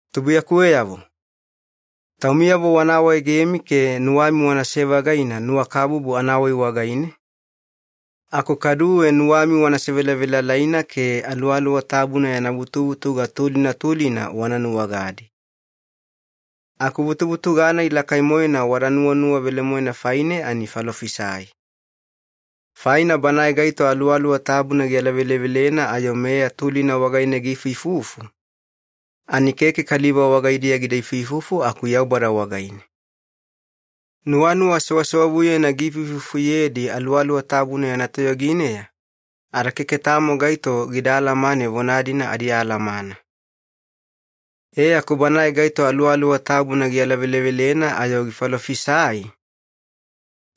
Tubuiyakuweyavo, taumiyavo wana awaegemi ke nuwami wanase-vagaina nuwakabubu anawai wagaine, aku kaduwe nuwami wana sevelavelalaina ke Aluwaluwa Tabuna yana vutuvutuga tulina tulina wana nuwagadi. Aku vutuvutuga-nai lakai-moena wada nuwanuwa velemoena faine ani falofisai. Faina banae gaito Aluwaluwa Tabuna gialavelevelena ayo meya tulina wagaine giifuifufu, ani keke kaliva wagaidiya gida ifuifufu aku Yaubada wagaine. Nuwanuwa sewsewavuyena giifuifufuyedi Aluwaluwa Tabuna yana toyogineya, ada keke tamo gaito gida alamane vona-dina adialamana. E aku banae gaito Aluwaluwa Tabuna gialavelevelena ayo gifalofisai,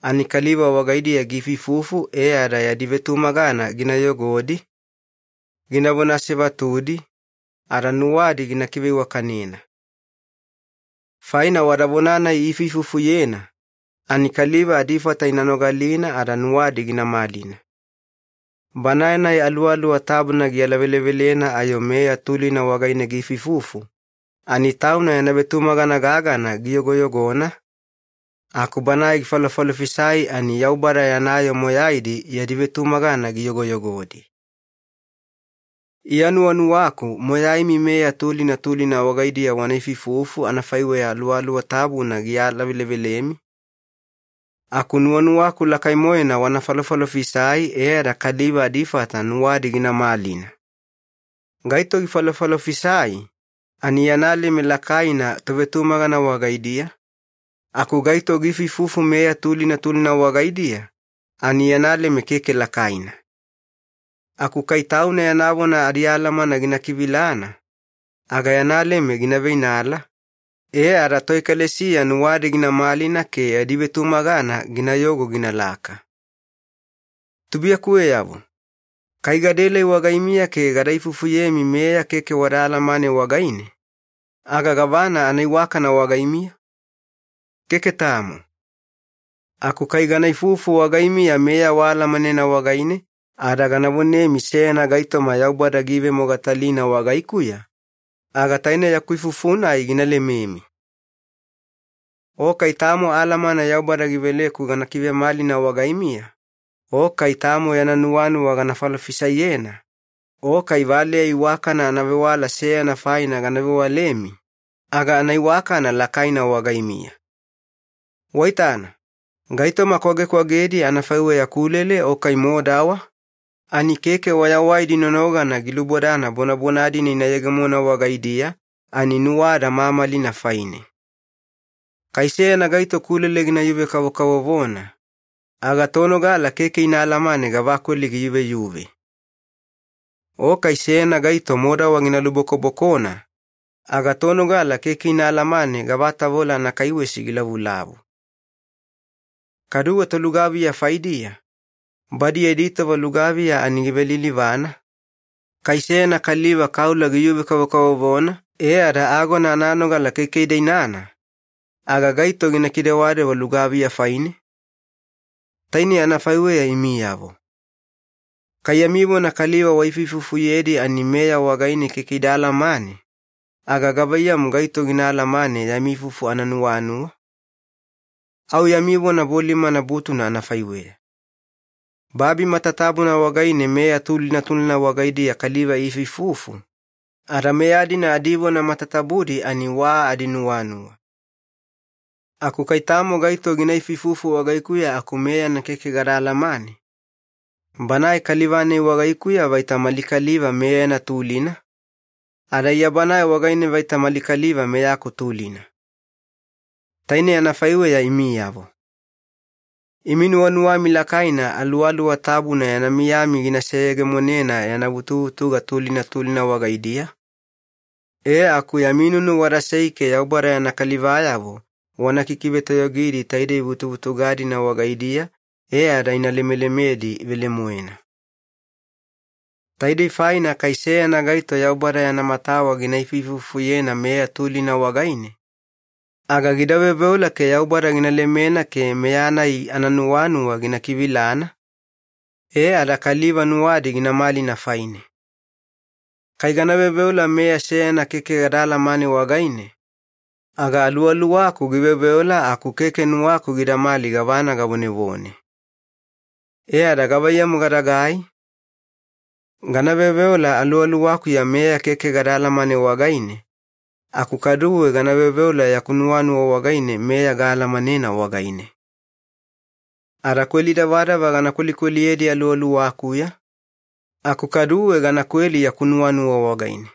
ani kaliva wagaidiya giifuifufu e ada yadi vetumagana gina yogodi, ginavona asevatudi, ada nuwadi gina kiveiwakanena. Faina wada vona-nai iifuifufuyena, ani kaliva adifata ina nogalina ada nuwadi gina malina. Banae-nai Aluwaluwa Tabuna gialavelevelena ayo meya tulina wagaine giifuifufu, ani tauna yana vetumagana gagana giyogoyogona, aku banae gifalofalofisai ani Yaubada yana yoo moyaidi yadi vetumagana giyogoyogodi. Iya nuwanuwaku moyaimi meya tulina tulina wagaidiya wana ifuifufu anafaiweya Aluwaluwa Tabuna gialavelevelemi, aku nuwanuwaku lakai-moena wana falofalofisai e ada kaliva adifata nuwadi gina malina. Gaito gifalofalofisai ani yana leme lakaina tovetumagana wagaidiya, aku gaito giifuifufu meya tulina tulina wagaidiya ani yana leme keke lakaina. Aku kai tauna yana vona adialamana gina kivilana, aga yana leme gina veinala, e ada toekalesiya nuwadi gina malina ke yadi vetumagana ginayogo ginalaka. Tubuiyakuweyavo, kai gadaelai wagaimiya ke gada ifufuyemi meya keke wada alamane wagaine, aga gavana anaiwakana wagaimiya? Keke tamo. Aku kai gana ifufu wagaimiya meya waalamanena wagaine ada gana vonemi seyana gaitoma Yaubada giivemogatalina wagaikuya, aga taine yaku ifufu-nai gina lememi. O kai tamo alamana Yaubada giveleku gana kivemalina wagaimiya, o kai tamo yana nuwanuwa gana falofisaiyena, o kai valeya iwakana anavewala seyana faina gana vewalemi, aga anaiwakana lakaina wagaimiya. Waitana, gaitoma kwagekwagedi anafaiweya kulele o kai modawa, ani keke wayawaidi nonogana gilubodana bonabona-dina ina yegemona wagaidiya ani nuwada mamalina faine. Kai seyana gaito kulele gina yuve-kavokavovona, aga tonogala keke ina alamane gavakweli giyuveyuve. O kai seyana gaito modawa gina lubokobokona, aga tonogala keke ina alamane gavatavola anakaiwesi gilavulavu. Kaduwe tolugaviya faidiya, badi yadi tova lugaviya ani givelilivana, kai seyana kaliva kaula giyuve-kavokavovona e ada agona ananogala keke ida inana, aga gaito gina kidewadewa lugaviya faine? Tainei anafaiweya imiyavo. Kai yami vona kaliva waifuifufuyedi ani meya wagaine keke ida alamane, aga gavaiyamu gaito gina alamane yami ifufu ananuwanuwa? Au yami vona bolimana butuna anafaiweya. Babi matatabuna wagaine meya tulina tulina wagaidiya kaliva iifuifufu, ada meya-dina adivona matatabudi ani wa adinuwanuwa. Aku kai tamo gaito gina ifuifufu wagaikuya aku meyana keke gada alamane, banae kaliva-nai wagaikuya vaita mali kaliva meyana tulina, ada Iya banae wagaine vaita mali kaliva meyaku tulina. Tainei anafaiweya imiyavo. Imi nuwanuwami lakaina Aluwaluwa Tabuna yana miyami gina seyegemonena yana vutuvutuga tulina tulina wagaidiya, e aku yami nunu wadasei ke Yaubada yana kalivayavo wana kikivetoyogidi taidei vutuvutuga-dina wagaidiya e ada ina lemelemedi velemoena. Taidei faina kai seyana gaito Yaubada yana matawa gina ifuifufuyena meya tulina wagaine, aga gida veoveola ke Yaubada gina lemena ke meya-nai ananuwanuwa gina kivilana, e ada kaliva nuwadi gina malina faine. Kai gana veoveola meya seyana keke gada alamane wagaine, aga aluwaluwaku giveoveola aku keke nuwaku gidamali gavana gavonevone. E ada gavaiyamu gadagai? Gana veoveola aluwaluwakuya meya keke gada alamane wagaine, aku kaduwe gana veoveola yaku nuwanuwa wagaine meya gaalamanena wagaine. Ada kweli davadava gana kwelikweliyedi aluwaluwakuya, aku kaduwe gana kweli yaku nuwanuwa wagaine.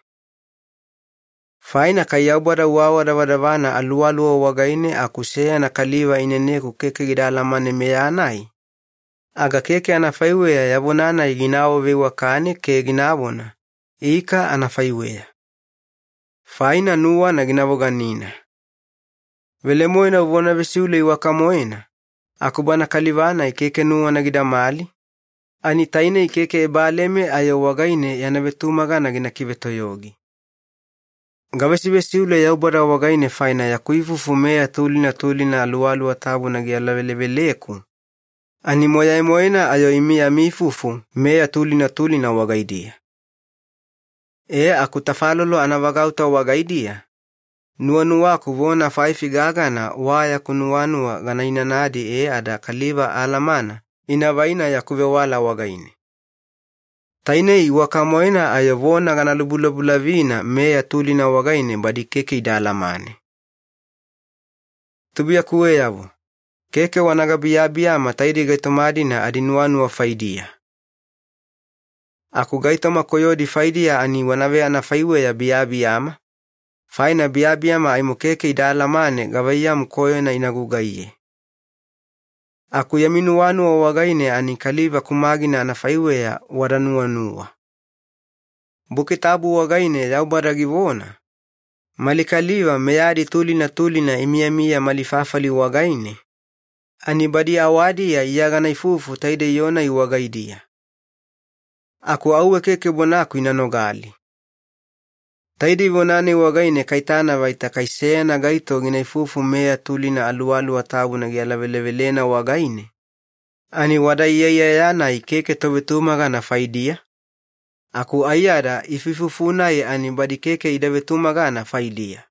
Faina kai Yaubada uawadavadavana aluwaluwa wagaine aku seyana kaliva ineneku keke gida alamane meya-nai, aga keke anafaiweya ya vona-nai gina awaveiwakane ke ginavona, “Ika anafaiweya.” Faina nuwana gina voganina. Velemoena uvona vesiule iwaka-moena, aku bana kaliva-nai keke nuwana gidamali, ani tainei keke ebaleme ayo wagaine yana vetumagana gina kivetoyogi. Gavesivesiule Yaubada wagaine faina yaku ifufu meya tulina tulina Aluwaluwa Tabuna gialaveleveleku, ani moyai-moena ayo imi yami ifufu meya tulina tulina wagaidiya. E aku tafalolo anavagauta wagaidiya, nuwanuwaku vona faifi gagana wa yaku nuwanuwa gana inanadi e ada kaliva alamana ina vaina yaku vewala wagaine. Tainei iwaka-moena ayo vona gana lubulabulavina meya tulina wagaine badi keke ida alamane. Tubuiyakuweyavo, keke wana gabiyabiyama taidei gaitoma-dina adinuwanuwa faidiya. Aku gaitoma koyodi faidiya ani wana veanafaiweya biyabiyama, faina biyabiyama aimo keke ida alamane gavaiyamu koyona ina gugaiye. Aku yami nuwanuwa wagaine ani kaliva kumagina anafaiweya wada nuwanuwa. Buki Tabu wagaine Yaubada givona, “Mali kaliva meyadi tulina tulina imiyamiya mali fafali wagaine, ani badi awadiya Iya gana ifufu taidei yoo-nai wagaidiya. Aku auwe keke bonaku ina nogali.” Taidei vona-nai wagaine kaitana vaita kai seyana gaito gina ifufu meya tulina Aluwaluwa Tabuna gialavelevelena wagaine, ani wada iyaiyaya-nai keke tovetumagana faidiya, aku aiyada ifuifufu-nai ani badi keke ida vetumagana faidiya.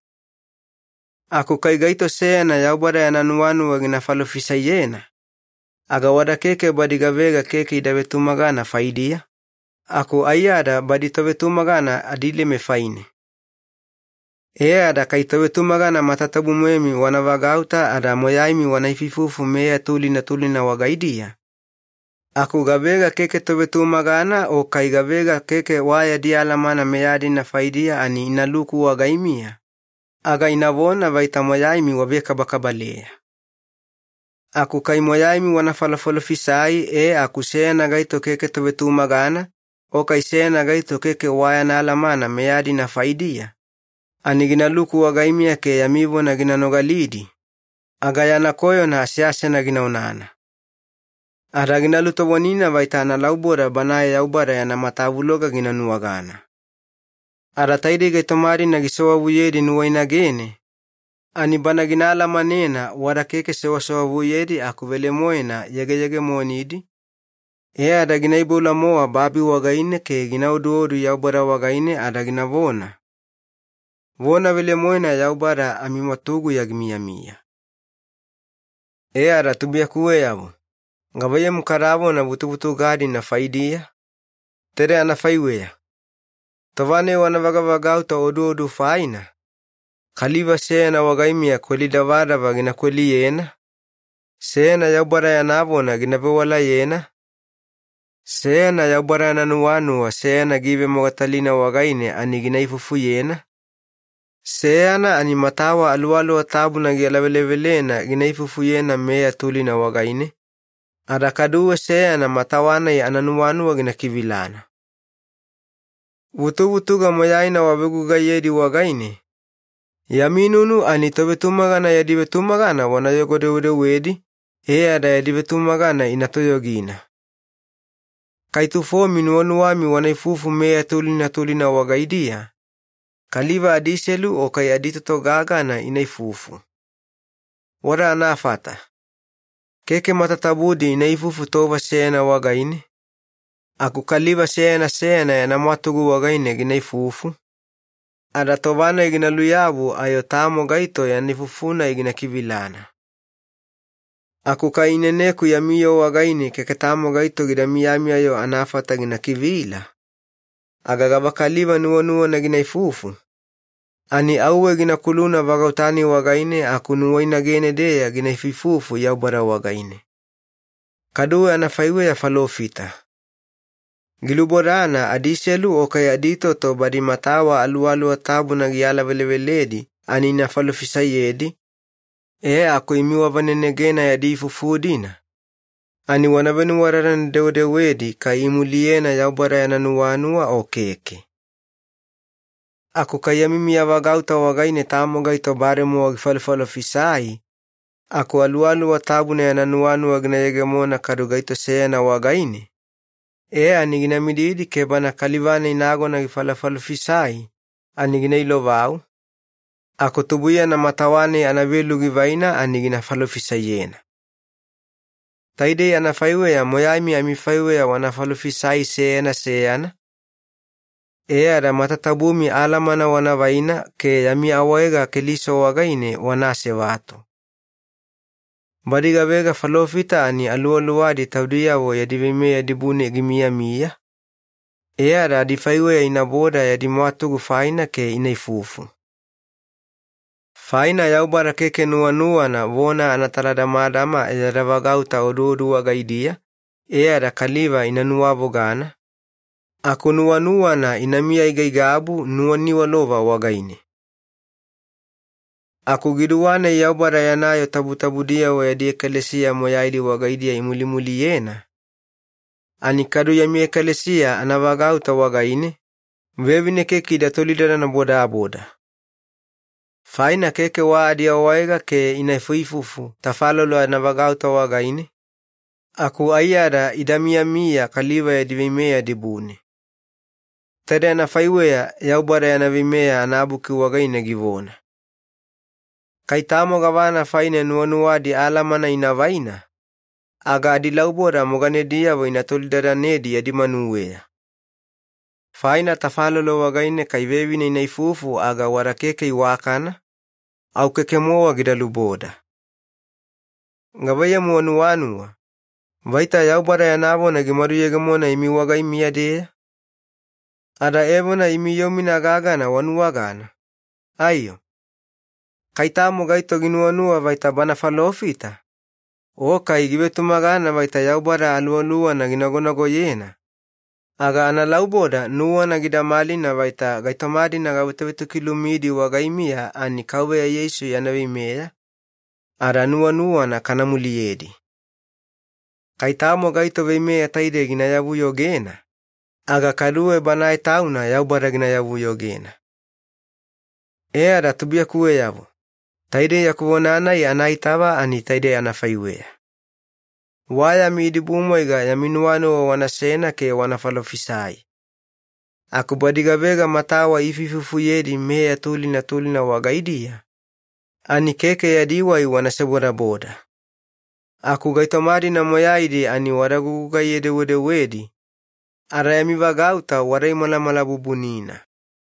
Aku kai gaito seyana Yaubada yana nuwanuwa gina falofisaiyena, aga wada keke badi gavega keke ida vetumagana faidiya, aku aiyada badi tovetumagana adileme faine. E ada kai tovetumagana matatabu-moemi wana vagauta ada moyaimi wana ifuifufu meya tulina tulina wagaidiya, aku gavega keke tovetumagana o kai gavega keke wa yadi alamana meya-dina faidiya ani inaluku wagaimiya, aga inavona vaita moyaimi wavekabakabaleya. Aku kai moyaimi wana falofalofisai e aku seyana gaito keke tovetumagana o kai seyana gaito keke wa yana alamana meya-dina faidiya, ani ginaluku wagaimiya ke yami vona gina nogalidi, aga yana koyona aseasena gina onana. Ada gina lutovonina vaita analauboda banae Yaubada yana matavuloga gina nuwagana. Ada taidei gaitoma-dina gisewavuyedi nuwainagene, ani bana gina alamanena wada keke sewasewavuyedi aku velemoena yegeyegemonidi, e ada gina iboula-mowa babi wagaine ke gina oduodu Yaubada wagaine ada ginavona, “Vona velemoena Yaubada amimwatuguya gimiyamiya.” E ada tubuiyakuweyavo, gavaiyamu kadavona vutuvutuga-dina faidiya? Taide anafaiweya. Tova-nai wana vagavagauta oduodu faina, kaliva seyana wagaimiya kweli davadava gina kweliyena, seyana Yaubada yana vona gina vewalayena, seyana Yaubada yana nuwanuwa seyana givemogatalina wagaine ani gina ifufuyena, seyana ani matawa Aluwaluwa Tabuna gialavelevelena gina ifufuyena meya tulina wagaine, ada kaduwe seyana matawa-nai ananuwanuwa gina kivilana. Vutuvutuga moyaina wavegugaiyedi wagaine, yami nunu ani tovetumagana yadi vetumagana wanayogo-dewedewedi e ada yadi vetumagana ina toyogina. Kai tufomi nuwanuwami wana ifufu meya tulina tulina wagaidiya, kaliva adiselu o kai aditoto gagana ina ifufu. Wada anafata. Keke matatabudi ina ifufu tova seyana wagaine, aku kaliva seyana seyana yana mwatugu wagaine gina ifufu, ada tova-nai gina luyabu ayo tamo gaito yana ifufu-nai gina kivilana. Aku kai ineneku yami yoo wagaine keke tamo gaito gida miyami-yo anafata gina kivila, aga gavakaliva nuwanuwana gina ifufu, ani auwe gina kuluna vagauta-nai wagaine aku nuwainagene-deya gina ifuifufu Yaubada wagaine. Kaduwe anafaiweya falofita. Gilubodana adiselu o kai aditoto badi matawa Aluwaluwa Tabuna gialaveleveledi ani ina falofisaiyedi, e aku imi wavanenegena yadi ifufu-dina ani wana venuwadadane-dewedewedi kai imuliyena Yaubada yana nuwanuwa o keke. Aku kai yami miyavagauta wagaine tamo gaito bademowa gifalofalofisai aku Aluwaluwa Tabuna yana nuwanuwa gina yegemona kadu gaito seyana wagaine, e ani gina mididi ke bana kaliva-nai nagona gifalofalofisai ani gina ilovau, aku tubuiyana matawa-nai anavelu givaina ani gina falofisaiyena. Taidei anafaiweya moyaimi amifaiweya wana falofisai seyana seyana, e ada matatabumi alamana wana vaina ke yami awaega Keliso wagaine wana asevatu. Badi gavega falofita ani aluwaluwadi taudiyavo yadi veimeya dibune gimiyamiya, e ada adifaiweya inaboda yadi mwatugu faina ke ina ifufu. Faina Yaubada keke nuwanuwana vona anataladamadama yada vagauta oduodu wagaidiya e ada kaliva ina nuwavogana, aku nuwanuwana inamiya aigaigabu nuwaniwalova wagaine. Aku giduwa-nai Yaubada yana yoo tabutabudiyavo yadi ekalesiya moyaidi wagaidiya imulimuliyena, ani kadu yami ekalesiya anavagauta wagaine, vevine keke ida tolidadana bodaboda. Faina keke wa adiawaega ke ina ifuifufu tafalolo anavagauta wagaine, aku aiyada ida miyamiya kaliva yadi veimeya dibune. Taide anafaiweya Yaubada yana Veimeya anabuki wagaine givona. Kai tamo gavana faine nuwanuwadi alamana ina vaina, aga adilauboda moganediyavo ina tolidadanedi yadi manuweya. Faina tafalolo wagaine kai vevine ina ifufu aga wada keke iwakana, au keke-mowa gida luboda. Gavaiyamu wanuwanuwa, vaita Yaubada yana vona gimaduyegemona imi wagaimiya-deya? Ada evona imi yoo-mina gagana wanuwagana, aiyo? Kai tamo gaito ginuwanuwa vaita bana falofita, o kai givetumagana vaita Yaubada Aluwaluwana ginagonagoyena, aga analauboda nuwana gida malina vaita gaitoma-dina gavetovetokilumidi wagaimiya ani Kauveya Yeisu yana veimeya, ada nuwanuwana kana muliyedi. Kai tamo gaito veimeya taidei gina yavuyogena, aga kaduwe banae tauna Yaubada gina yavuyogena. E ada tubuiyakuweyavo, taidei yaku vona-nai anaitava ani taidei anafaiweya. Wa yami idibumwaiga yami nuwanuwa wanasena ke wana falofisai. Aku badi gavega matawa iifuifufuyedi meya tulina tulina wagaidiya, ani keke yadi wai wana sebodaboda. Aku gaitoma-dina moyaidi ani wada gugugaiye-dewedewedi, ada yami vagauta wada imalamalabubunina.